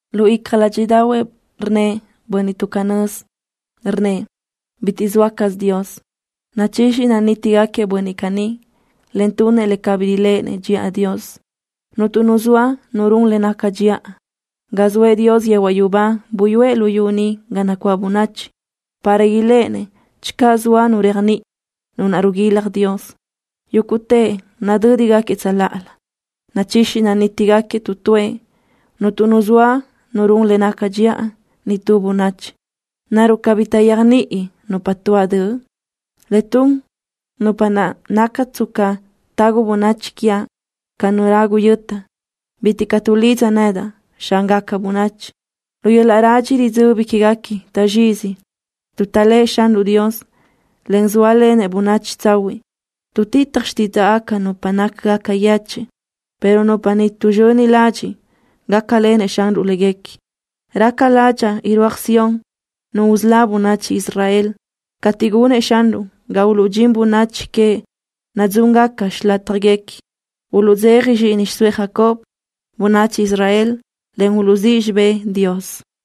Lu icja ládxiʼdaʼahuëʼ rnnëʼ bönniʼ tuʼ canö́z, rnnëʼ: Bitiʼ zoa caz Dios. Nachixi nanítigaquiëʼ bönniʼ caní, en tunëʼ le cabí riléʼenëʼ dxiʼa Dios. Cuntu nu zoa nu run le naca dxiʼa. Ga zoëʼ Dios yehuaʼ yubá buyúëʼ luyú ni ga nacuáʼ bönachi para iléʼenëʼ channö zoa nu réajniʼi, nu naʼ riguilaj Dios. Yúguʼtëʼ nadö́digaquiëʼ tsöláʼalö. Nachixi nanítigaquiëʼ tu tuëʼ. Cuntu nu zoa nu run le naca dxiʼa, nitú bönachi. ¿Naruʼ cabí taʼyéajniʼi nupa tuáʼ döʼ? Le tun nupa naʼ naca tsca tagu bönachi quiaʼ ca nu ragu yöta. Bitiʼ caʼ tuʼlidza nedaʼ, Xángaca bönachi. Lu yöl-laʼ radxi ridzöbi quéguequi taʼzxizi tuʼ taʼléʼe Xanruʼ Dios, en zóalenëʼ bönachi tsahuiʼ. Tuʼtitaj xtídzaʼgaca nupa nácagaca yechiʼ, pero nupa ni tuʼzxöni ladxiʼ gácalenëʼ Xanruʼ léguequi. Raca ládxaʼa irúaj Sión Nu usölá bönachi Israel. Cateʼ gunëʼ Xanruʼ ga uluʼdxín bönachi queëʼ nadzúngaca xilátjaguequi, uluʼdzeja zxíʼini xiʼsóëʼ Jacob, bönachi Israel, en uluʼzíʼ xibë́ʼ Dios.